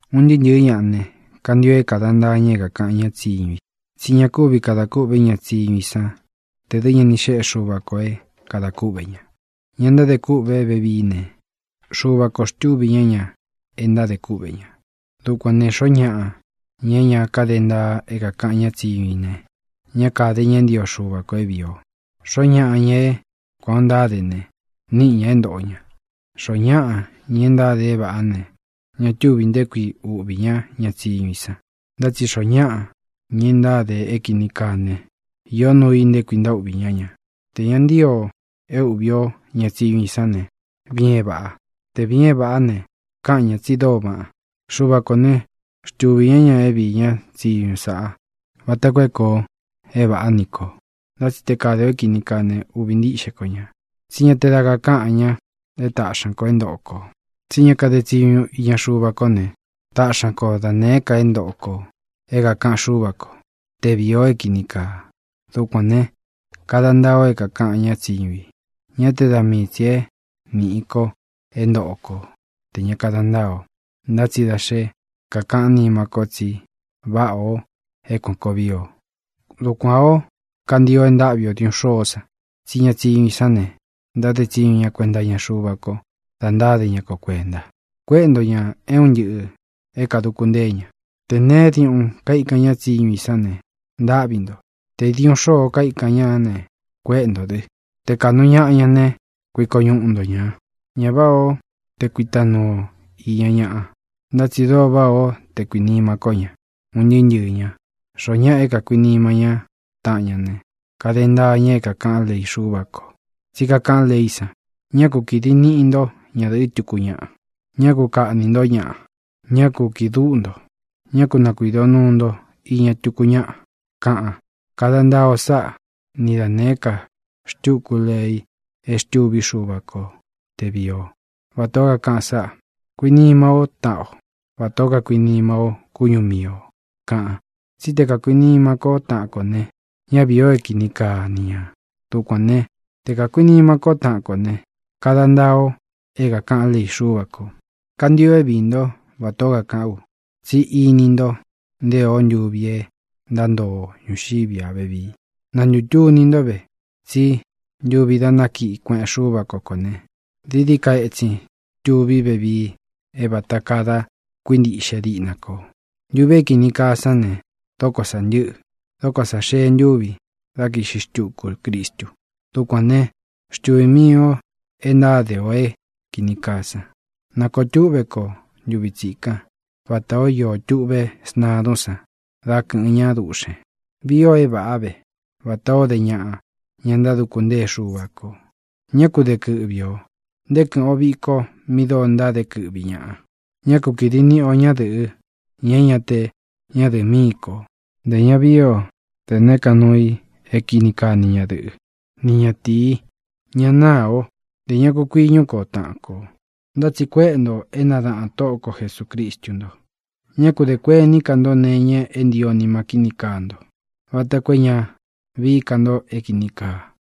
Un ntɨɨ́ ntɨ̄ɨ́ ñaꞌa ne, kantio é kāda ntaa ña é kākaꞌan ñá tsiñu i, tsí ña kúvi kadā kûꞌvé ña tsiñu i san tē dɨ́ ña ni xéꞌe Xuva kō é kadā kúꞌvē ña. Ña ntádē kûꞌvé vevií ne, Xuva kō xtúvī ñá ña e ntádē kúꞌvē ña. Dukuān ne, xoó ñaꞌa, ña é ña káde ntaa é kākaꞌan ñá tsiñu i ne, ñá kāde ña é ntio Xuva kō é vīi o. Xoó ñaꞌa, ña é kuān ó ntáde ne, níꞌi ñā é ntōꞌo ña. Xoó ñaꞌa, ña e ntáde é vāꞌá ne, ña túvī nté kui uꞌvī ñá ña tsiñu i san. Ntá tsi xoó ñaꞌa, ña e ntáde é kīni kaa ne, iō nuu i nté kui ntaúꞌvī ñá ña. Tē ña ntío o é uꞌvī o ñá tsiñu i sán ne, viin é vāꞌa. Te vīin é vāꞌá ne, káꞌan ñā tsi dóo vaꞌan. Xuva kō né, xtuvī ñá ña é viī ñá tsiñu sāꞌa vata koo é kōo é vāꞌá ni kō. Ntá tsi te kade ō é kīni kaa ne, uꞌvī ntíꞌxe ko ñā, tsí ña te da kakáꞌan ña é taꞌxi ña kō é ntoꞌo kō. Tsí ña kade tsiñu iña Xuva kó ne, taꞌxi ña ko da nēé ka é ntoꞌo kō é kākaꞌan Xúva kō, te vīi o é kīni kaa. Dukuān ne, kada ntaa o é kākaꞌan ñá tsiñu i, ñá te da mii tsī é nīꞌi ko é ntoꞌo ko tē ña kada ntáa ō, ntá tsi da xé kakaꞌán nima ko tsi váꞌā o é kuān koo vii o. Dukuān ó, kantio e ntáꞌvi o diūꞌun xoó san, tsí ña tsiñu i sán ne, ntáde tsiñu ña kuenta iña Xuva ko da ntáde ña ko kuēnta. Kuéꞌe nto ñā é un ntɨꞌɨ̄ é kāduku ntée ña. Tē neé diuꞌun kaíkan ñá tsiñu i sán ne, ntáꞌvi nto. Tē diuꞌun xóo kaikan ñá ne, kuéꞌe ntō dɨ. Te kāꞌnu ñaꞌa ña né, kuiko ñuꞌu nto ñā. Ñá vāꞌá o te kuita nuu o īña ñaꞌa. Ntá tsi dóo váꞌa o te kuīnima kó ña, un ntɨɨ́ ntɨɨ̄ ña. Xoó ñaꞌa é kākuinima ñá taꞌan ña ne, kade ntaa ña é kākaꞌán lei Xúva kō. Tsí kakaꞌán leí san: “Ñá ku kīdi niꞌi nto ñádɨ̄ꞌɨ́ tuku ñaꞌa; ñá ku kāꞌní nto ñaꞌa; ñá ku kīꞌi dúꞌu nto; ñá ku nakuīdo nuu nto iña tuku ñáꞌa”, kaꞌan. Kada ntaa o sáꞌa, ni da nēé ka xtuku lei e xtûví Xuva ko te vīi ó, vatā ó kakaꞌan sáꞌā: “Kuinima ó taꞌan o vatā ó kakuinima ó kúñu mii ō”, kaꞌan. Tsí te kakuīnima kó taꞌan kō ne, ñá viī o é kini kaa ni ñā. Dukuān né, te kakuīnima kó taꞌan kō ne, kada ntaa o é kākaꞌán lei Xúva kō. Kantio é viī ntó vatā ó kakaꞌán u, tsi íni nto nté ō ntúvi e ntántoo o ñūxiví a vevii. Na ntūtuni ntó ve, tsí ntuvi dá nakiꞌi kueꞌen Xúva ko kō ne, dií dií ka ētsin tuví vevii é vāta kaa da kuíntiꞌxe diꞌna kō. Ntuvi é kīni kaa sán ne, dóko sā ntɨ́ꞌɨ. Dóko sā xee ntúvi dá kīꞌxi xtuku Cristu. Dukuān né, xtuvī mii o e ntáde ō é kīni kaa san. Na kōo túꞌve kó ntuvi tsikan vatā ó iō tuꞌvé sntadún san dá kɨ̄ꞌɨn ñá duꞌxēn. Vii ō é vāꞌá ve, vatā ó de ñaꞌa, ña ntáduku ntée Xuva kō. Ñá ku de kɨꞌvi ō; nté kɨ̄ꞌɨn o viko mi dóo ntáde kɨꞌvi ñaꞌa. Ñá ku kīdi niꞌi o ñádɨ̄ꞌɨ, ña é ña te ñádɨ̄ꞌɨ míi kō; ntē ña vií o da nēé ka nuu i é kini kaa ni ñadɨ̄ꞌɨ́, ni ñatīi. Ña náā ó; ntē ña ku kuiñɨ́ ko taꞌan kō. Ntá tsi kuéꞌe ntō é nadāꞌan Tóꞌo ko Jesūcristu nto. Ñá ku dē kuení ka nto nee iña é ntio nima kíni kaa nto, vata koo é ña vií ka nto é kīni kaa.